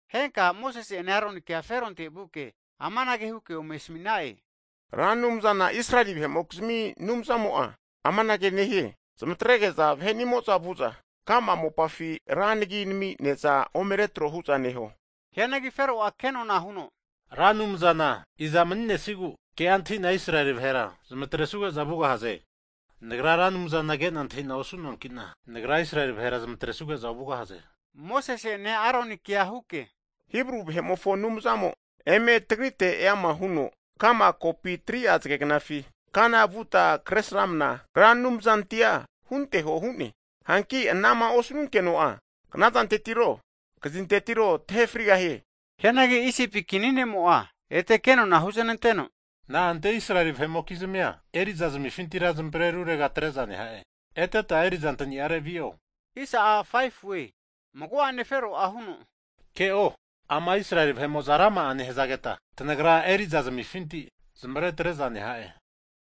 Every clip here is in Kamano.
Henka Mosese'ene Aronikea Feronte vuke amanage huke ome asmi'na'e, Ra Anumzana Israeli vahe'mokizmi Anumzamo'a amanage nehie, zmatrege'za vahe'ni'amo'za vu'za kama mopafi ranagima nami ne'za ome retro hu'za neho. Hianagi Fero'a ke'nona huno, Ra Anumzana i'za mani'nesigu ke'a antahi'na Israeli vahera zamatresnuge'za vugahaze? Nagra Ra Anumzana ke'na antahi'na osu'noanki'na, nagra Israeli vahera zmatresuge'za ovugahaze! Mosese'ene Aronikea huke, Hibru vahe'mofo Anumzamo eme tagrite eama huno, ka'ma kopi 3'a zagegnafi kana vuta, kresramna Ra Anumzantia hunteho hu'ne. Hanki anama osanunkeno'a knazantetiro, kazintetiro tahe frigahie. Hianagi Isipi kinimo'a, ete kenona huznanteno, Na'ante Israeli vahe'mokizmia eri'za zmifintira zmavre rurega atre'za neha'e? Eteta eri'zantaniare vi'o! Mago'ane Fero'a huno, ke'o, ama Israeli vahe'mo'za rama'a nehzageta, tanagra eri'za zmifinti zmaretre'za neha'e.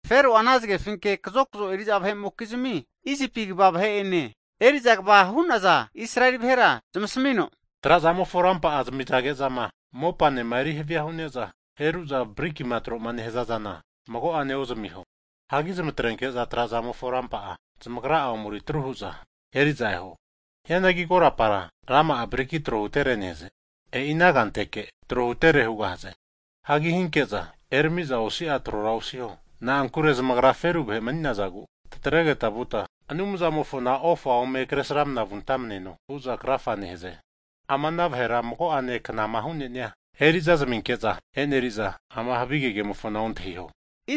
Fero'a ana zagefinke kazokzo eri'za vahe'mokizmi Isipi kva vahe'ene, eri'za kva hu'naza Israeli vahera zamasmino, trazamofo rampa'a zamizage'zama mopanema eri havia hu'ne'za heru'za briki'ma tro nehaza zana mago'ane ozmiho, hagi zmatrenke'za trazamofo rampa'a, zamagra'a ome eritru hu'za eri'za eho. Hianagi korapara nama'a briki tro hutere nehaze, e'i ana kanteke tro hutere hugahaze. Hagi hinke'za erami'za osi'a trora osiho. Na'ankure zamagra feru vahe mani'nazagu, tatregeta vuta Anumzamofona ofa ome kresramna vuntamaneno hu'za krafa nehaze. Ama ana vahera mago'ane knama hu'neni'a eri'za zaminke'za eneri'za, ama havige kemofona ontahiho!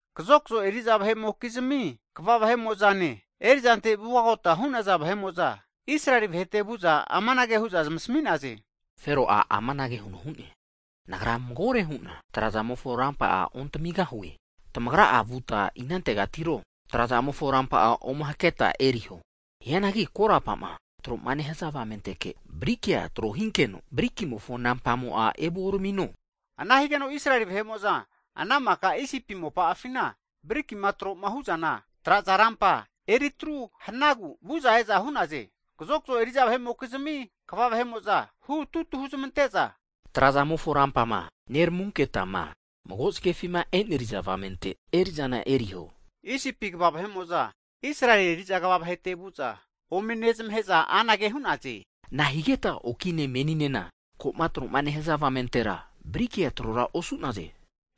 Kazokzo eri'za vahe'mokizmi kva ne, erizante vugagota hu'naza vahe'mo'za, Israeli vahete vu'za amanage hu'za zamasami'naze, Fero'a amanage huno hu'ne, Nagra magore hu'na trazamofo rampa'a ontamigahue. Tamagra'a vuta inantegatiro trazamofo rampa'a ome haketa eriho. Hianagi korapa'ma tro'ma nehaza avamenteke brikia tro hinkeno brikimofo nampamo'a evuoramino. Ana higeno Israeli vahe'mo'za ana maka Isipi mopa'afina briki'ma tro'ma hu'zana traza rampa eri atru hanagu, vu'za e'za hu'naze. Kazokzo eri'za vahe'mokizmi kva vahe'mo'za, hu tutu huzmante'za, trazamofo rampama neramunketama mago zagefima eneriza avamente eri'zana eriho. Isipi kva vahe'mo'za, Israeli eri'za kva vahete vu'za ome nezmahe'za anage hu'naze, nahigeta okine meninena ko'ma tro'ma nehaza avamentera brikia trora osu'naze?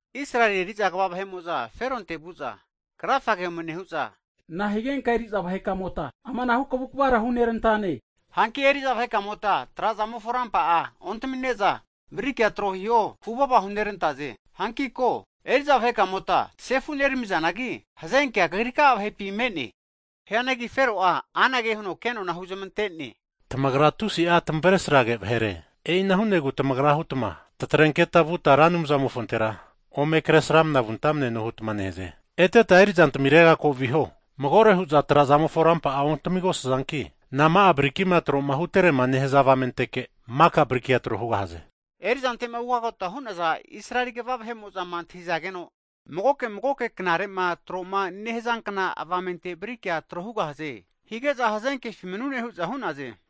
Israeli eri'za kva vahe'mo'za Feronte vu'za krafage ome nehu'za, nahigenka eri'za vahekamota amanahu kavu kvara hunerantane? Hanki eri'za vahekamota trazamofo rampa'a ontami'ne'za, brikia tro hiho huvava hunerantaze. Hanki ko, eri'za vahekamota sefu neramizanagi, hazenkea kagrika'a vahepi me'ne. Hianagi Fero'a anage huno kenona huzmante'ne, Tamagra tusi'a tamavresrage vahere! E'ina hu'negu tamagra hutma, tatrenketa vuta Ra Anumzamofontera ome kresramna vuntamneno hutma nehaze. Eteta eri'zantamirega ko viho. Magore hu'za trazamofo rampa'a ontamigosazanki, nama'a briki'ma troma huterema nehaze avamenteke maka brikia tro hugahaze. Eri'zante'ma ugagota hu'naza Israeli kva vahe'mo'zama antahizageno, magoke magoke knare'ma tro'ma nehazankna avamente brikia tro hugahaze hige'za, hazenkefi manune hu'za hu'naze.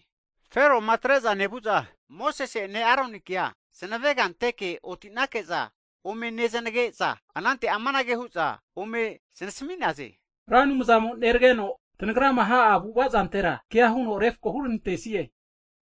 Feroma atre'za nevu'za, Mosese'ene Aronikea zmavega anteke oti'nake'za ome nezanage'za, anante amanage hu'za ome znasmi'na'e, Ra Anumzamo neranegeno tanagrama ha'a avu'ava zantera kea huno refko huranantesie.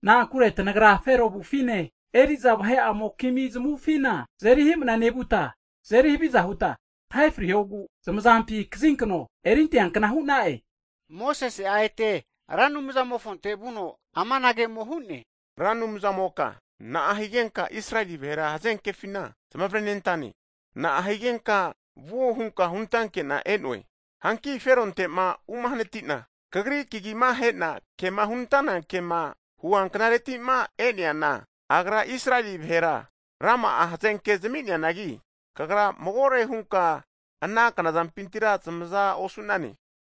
Na'ankure tanagra Fero avufine eri'za vahe'amokizmi zamavufina, tazeri himna nevuta tazeri haviza huta, tahe frihogu zamazampi kazinkano erinteankna hu'na'e. Mosese'a ete Ra Anumzamofonte vuno amanage ome hu'ne, Ra Anumzamoka, na'a higenka Israeli vahera hazenkefina zmavrenentane? Na'a higenka vuo hunka hunantanke'na e'noe? Hanki Feronte'ma umahanati'na Kagri kagima he'na kema humanantana kema huanknareti'ma e'neana, agra Israeli vahera rama'a hazenkea zami'neanagi, Kagra magore hunka ana knazampintira zamaza osu'nane.